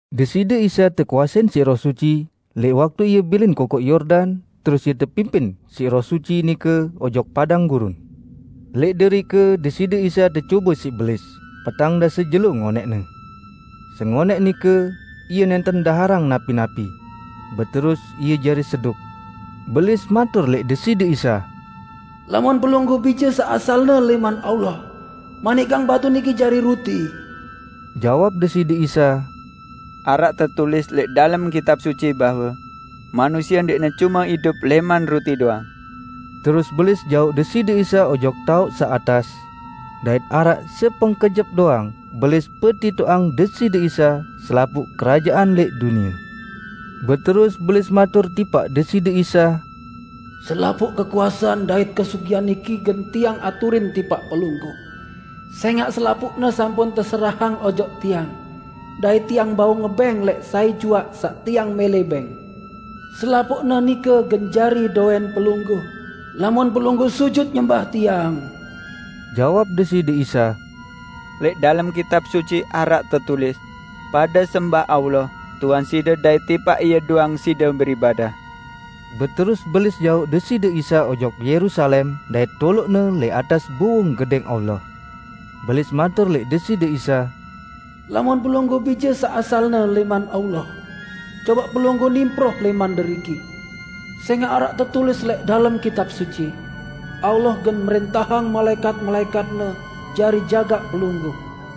Deside Isa tekuasein siq Roh Suci lẽq waktu Ie bilin Kokoq Yordan terus Ie tepimpin siq Roh Suci nike ojok padang gurun. Lẽq derike Deside Isa tecobe siq Belis petang dase jelo ngonẽqne. Sengonẽq nike, Ie nẽnten daharang napi-napi. Beterus Ie jari seduk. Belis matur lẽq Deside Isa, "Lamun Pelungguh Bije saq asalne lẽman Allah, manikang batu niki jari ruti." Jawab Deside Isa, "Araq tetulis lẽq dalem Kitab Suci bahwe: 'Manusie ndẽqne cume idup lẽman ruti doang.' " Terus Belis jauq Deside Isa ojok taoq saq atas, dait araq sepengkejep doang Belis petitoqang Deside Isa selapuq kerajaan lẽq dunie. Beterus Belis matur tipaq Deside Isa, "Selapuq kekuasean dait kesugihan niki gen tiang aturin tipaq Pelungguh, sẽngaq selapuqne sampun teserahang ojok tiang dait tiang bau ngebẽng lẽq sai juaq saq tiang mẽlẽ bẽng. Selapuqne nike gen jari dowẽn Pelungguh, lamun Pelungguh sujut nyembah tiang." Jawab Deside Isa, "Lẽq dalem Kitab Suci araq tetulis, 'Pade sembah Allah, Tuhan side dait tipaq Ie doang side beribadah.' " Beterus Belis jauq Deside Isa ojok Yerusalem dait toloq-Ne lẽq atas buwung Gedẽng Allah. Belis matur lẽq Deside Isa, "Lamun Pelungguh Bije saq asalne lẽman Allah, cobaq Pelungguh nimproh lẽman deriki. Sẽngaq araq tetulis lẽq dalem Kitab Suci, 'Allah gen mrẽntahang malaẽkat-malaẽkat-Ne jari jagaq Pelungguh.'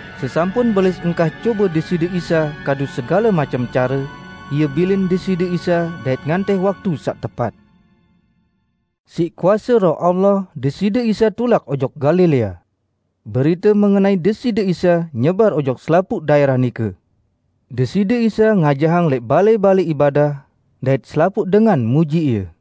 Sesampun Belis engkah cobe Deside Isa kadu segale macem care, ie bilin Deside Isa dait ngantih waktu saq tepat. Siq kuase Roh Allah Deside Isa tulak ojok Galilea. Berite mengenai Deside Isa nyebar ojok selapuq daẽrah nike. Deside Isa ngajahang lẽq balẽ-balẽ ibadah, dait selapuq dengan muji Ie.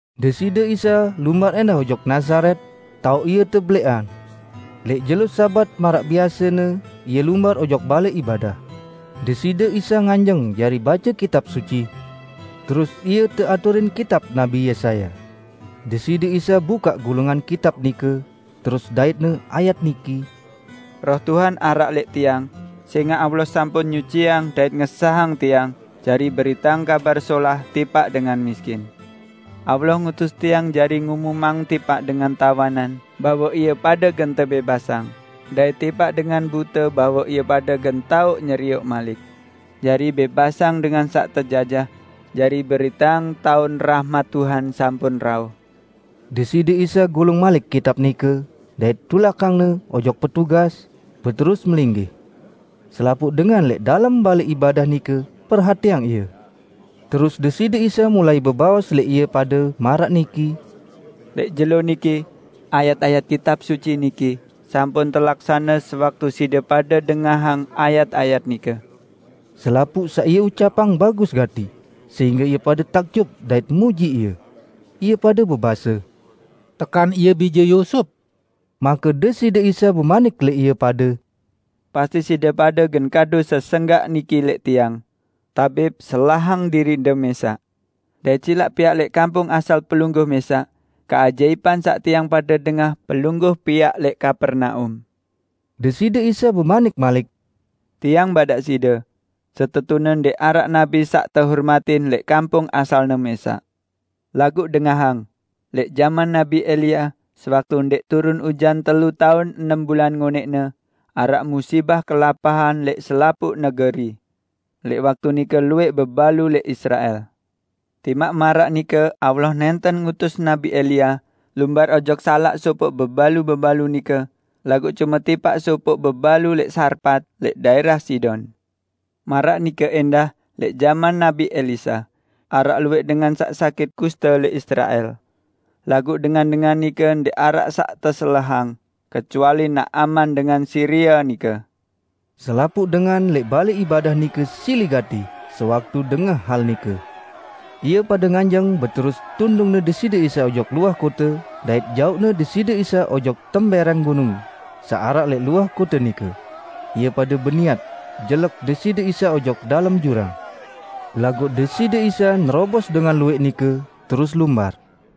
Deside Isa lumbar ẽndah ojok Nazaret, taoq Ie tebelẽqang. Lẽq jelo Sabat maraq biasene Ie lumbar ojok balẽ ibadah. Deside Isa nganjeng jari bace Kitab Suci, terus Ie teaturin kitab Nabi Yesaya. Deside Isa bukaq gulungan kitab nike, terus dait-Ne ayat niki, "Roh Tuhan araq lẽq Tiang, sẽngaq Allah sampun nyuciang dait ngesahang Tiang jari beriteang Kabar Solah tipaq dengan miskin. Allah ngutus Tiang jari ngumumang tipaq dengan tawanan bahwe ie pade gen tebẽbasang dait tipaq dengan bute bahwe ie pade gen tao nyerioq malik; jari bẽbasang dengan saq tejajah, jari beriteang taun rahmat Tuhan sampun rauh." Deside Isa gulung malik kitab nike, dait tulakang-Ne ojok petugas, beterus melinggih. Selapuq dengan lẽq dalem balẽ ibadah nike perhatiang Ie. Terus Deside Isa mulai bebaos lẽq ie pade maraq niki, "Lẽq jelo niki, ayat-ayat Kitab Suci niki sampun telaksane sewaktu side pade dengahang ayat-ayat nike." Selapuq saq Ie ucapang bagus gati, sehingge ie pade takjub dait muji Ie. Ie pade bebase, "Tekan Ie bije Yusup?" Make Deside Isa bemanik lẽq ie pade, "Pasti side pade gen kadu sesenggak niki lẽq Tiang, 'Tabib, selahang diriq-De mẽsaq. Dait silaq piaq lẽq kampung asal Pelungguh mẽsaq keajaipan saq tiang pade dengah Pelungguh piaq lẽq Kapernaum!' " Deside Isa bemanik malik, "Tiang badaq side, setetune ndẽq araq nabi saq tehormatin lẽq kampung asalne mẽsaq. Laguq dengahang: lẽq jaman Nabi Elia, sewaktu ndẽq turun ujan telu taun enem bulan ngonẽqne, araq musibah kelapahan lẽq selapuq negeri. Lẽq waktu nike luwẽq bebalu lẽq Israel. Timaq maraq nike Allah nẽnten ngutus Nabi Elia lumbar ojok salaq sopoq bebalu-bebalu nike laguq cume tipaq sopoq bebalu lẽq Sarpat lẽq daẽrah Sidon. Maraq nike ẽndah lẽq jaman Nabi Elisa, araq luwẽq dengan saq sakit kusta lẽq Israel, laguq dengan-dengan nike ndẽq araq saq teselahang, kecuali Naaman dengan Siria nike." Selapuq dengan lẽq balẽ ibadah nike sili gati sewaktu dengah hal nike. Ie pade nganjeng beterus tundungne Deside Isa ojok luah kote dait jauqne Deside Isa ojok tembẽrẽng gunung, saq araq lẽq luah kote nike. Ie pade beniat jelek Deside Isa ojok dalem jurang. Laguq Deside Isa nerobos dengan luwẽq nike, terus lumbar.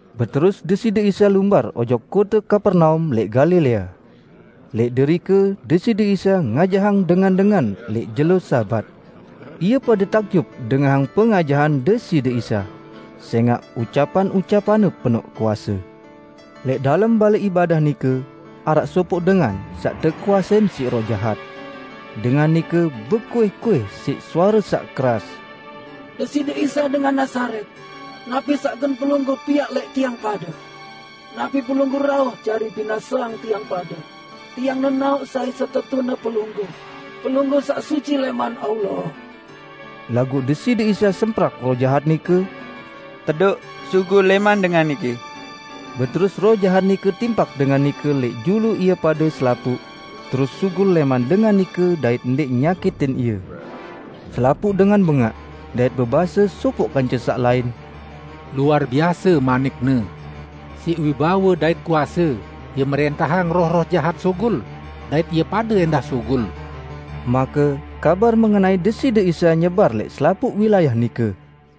Beterus Deside Isa lumbar ojok kote Kapernaum lẽq Galilea. Lẽq derike Deside Isa ngajahang dengan-dengan lẽq jelo Sabat. Ie pade takjub dengahang pengajahan Deside Isa, sẽngaq ucapan-ucapan-Ne penoq kuase. Lẽq dalem balẽ ibadah nike, araq sopoq dengan saq tekuasein siq roh jahat. Dengan nike bekuih-kuih siq suare saq keras, "Deside Isa, dengan Nazaret, napi saq gen Pelungguh piaq lẽq tiang pade? Napi Pelungguh rauh jari binaseang tiang pade? Tiang nenaoq sai setetune Pelungguh: Pelungguh Saq Suci lẽman Allah!" Laguq Deside Isa semprak roh jahat nike, "Tedoq sugul lẽman dengan niki!" Beterus roh jahat nike timpak dengan nike lẽq julu ie pade selapuq, terus sugul lẽman dengan nike dait ndẽq nyakitin ie. Selapuq dengan bengaq, dait bebase sopoq kance saq lain, "Luar biase manik-Ne. Siq wibawe dait kuase, Ie mrẽntahang roh-roh jahat sugul, dait ie pade ẽndah sugul!" Make kabar mengenai Deside Isa nyebar lẽq selapuq wilayah nike.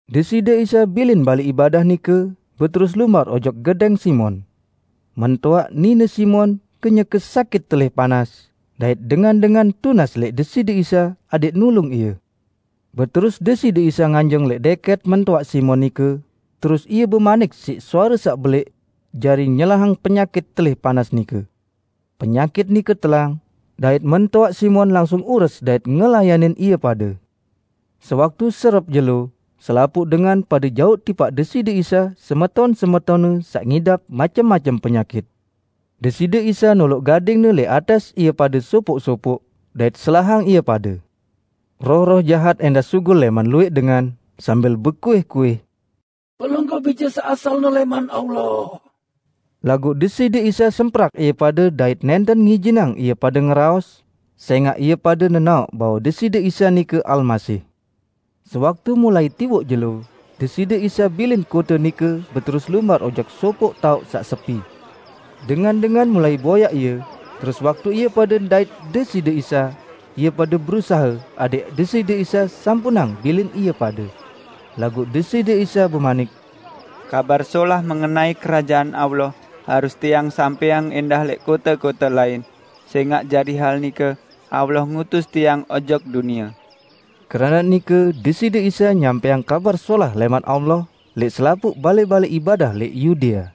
Deside Isa bilin balẽ ibadah nike, beterus lumbar ojok gedẽng Simon. Mentoaq nine Simon kenyeke sakit telih panas, dait dengan-dengan tunas lẽq Deside Isa adẽq nulung ie. Beterus Deside Isa nganjeng lẽq dẽkẽt mentoaq Simon nike, terus Ie bemanik siq suare saq belẽq jari nyelahang penyakit telih panas nike. Penyakit nike telang, dait mentoaq Simon langsung ures dait ngelayanin ie pade. Sewaktu serep jelo, selapuq dengan pade jauq tipaq Deside Isa semeton-semetonne saq ngidap macem-macem penyakit. Deside Isa noloq gading-Ne lẽq atas ie pade sopoq-sopoq dait selahang ie pade. Roh-roh jahat ẽndah sugul lẽman luwẽq dengan, sambil bekuih-kuih, "Pelungguh Bije saq asalne lẽman Allah!" Laguq Deside Isa semprak ie pade dait nẽnten ngijinang ie pade ngeraos, sẽngaq ie pade nenaoq bahwe Deside Isa nike Almasih. Sewaktu mulai tiwoq jelo, Deside Isa bilin kote nike beterus lumbar ojok sopoq taoq saq sepi. Dengan-dengan mulai boyaq Ie, terus waktu ie pade ndait Deside Isa, ie pade berusahe adẽq Deside Isa sampunang bilin ie pade. Laguq Deside Isa bemanik, "Kabar Solah mengenai Kerajaan Allah harus Tiang sampẽang ẽndah lẽq kote-kote lain, sẽngaq jari hal nike Allah ngutus Tiang ojok dunie." Keranaq nike Deside Isa nyampẽang Kabar Solah lẽman Allah lẽq selapuq balẽ-balẽ ibadah lẽq Yudea.